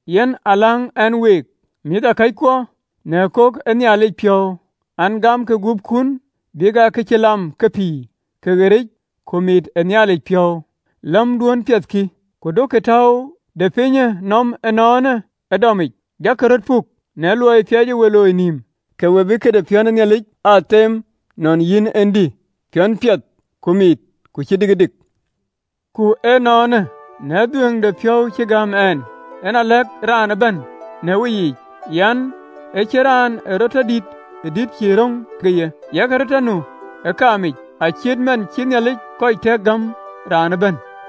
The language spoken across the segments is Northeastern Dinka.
Yen aa läŋ ɛn week, mïthëkɔckuɔ, në kok ë Nhialic piɔ̈u an, Gamkï gupkun abïk aa kë cï lam kë pïïr, kë ɣeric, kë mit ë Nhialic piɔ̈u, gämduön piɛth kï. Ku duökï täu de pinyë nɔm ënɔɔnë ee dɔmic, jakï röt puk në luɔi ë piɛcë we looi nïïm, ke we bï këde piɔ̈n ë Nhialic aa them nɔn yïn en dï, piɔ̈n piɛthë, ku mit, ku cï dikëdik. Ku ënɔɔnë, në dhuëëŋdepiɔ̈u cï gäm ɛn, yen a lɛ̈k raan ëbɛ̈n në weyiic an, ë cïn raan ee rɔt tɔ dït ë dït cïï röŋ ke ye, yak röt tɔ nu ë kaamic, acït man cï Nhialic kɔc tɛ̈k gäm raan ëbɛ̈n.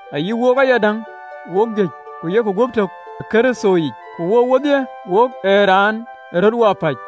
ayï wook ayadäŋ, wok juëc, ku yok guöp tök ë Kërthoyic, ku wook wodhie wok raan ë röt wapäc.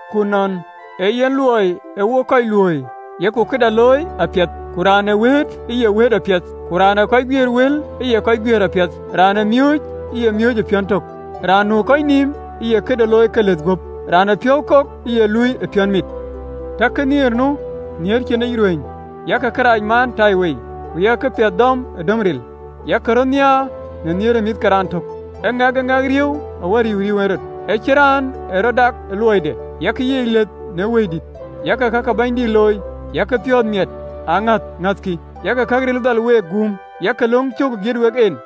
ku nɔn ee yen luɔi ee wok kɔc luööi, yok këda looi apiɛth, ku raan ee wëët, ë ye wëët apiɛth, ku raan ë kɔc guiëër wël, ë ye kɔc guiëër apiɛth, raan ë miööc, ë ye miööc ë piɔ̈n tök, raan nu ë kɔc nïïm, ë ye këde looi ke lëth guöp, raan ë piɔ̈u kok, ë ye luui ë piɔ̈n mit. Takkï nhiëër nu, nhiëër cïnic ruëëny. Yak kërac maan ëtaiwei, ku yak këpiɛth dɔm ë döm ril. Yak röt nhiaar në nhiëër ë mïth ke raan tök, ë ŋɛk e ŋɛk riëëu awär riëëu riëëu en rɔt. Ë cïn raan ë rɔt dak ë luɔide, yak yiic lëth në Wëidït, yak ka ke Bɛ̈nydït looi. Yak piɔ̈ɔ̈th miɛt ë aŋäth ŋäthkï, yak këril dhal week guum, yak lɔ̈ŋ cök ë giët wek en.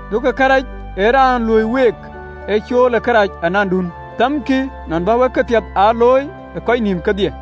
Duökï kërɛɛc ee raan luöi week ee cool ë kërac anandun. Thɛmkï nɔn bä wek këpiɛth aa looi ë kɔc nïïm kedhie.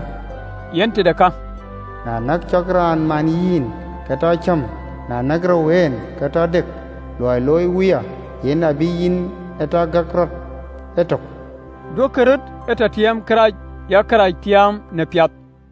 (LXX). Yen tëde ka, cït man cï këcïgɔ̈ɔ̈r ye lueel an, “Na näk cɔk raan man yïn, ke tɔ cäm, na näk rou en, ke tɔ dëk, luɔi loi wuya, yen abï yïn en tɔ gɔ̈k rɔt e tök.” Duökï röt e tɔ tiɛɛm kërac, yak kërac tiaam në piath.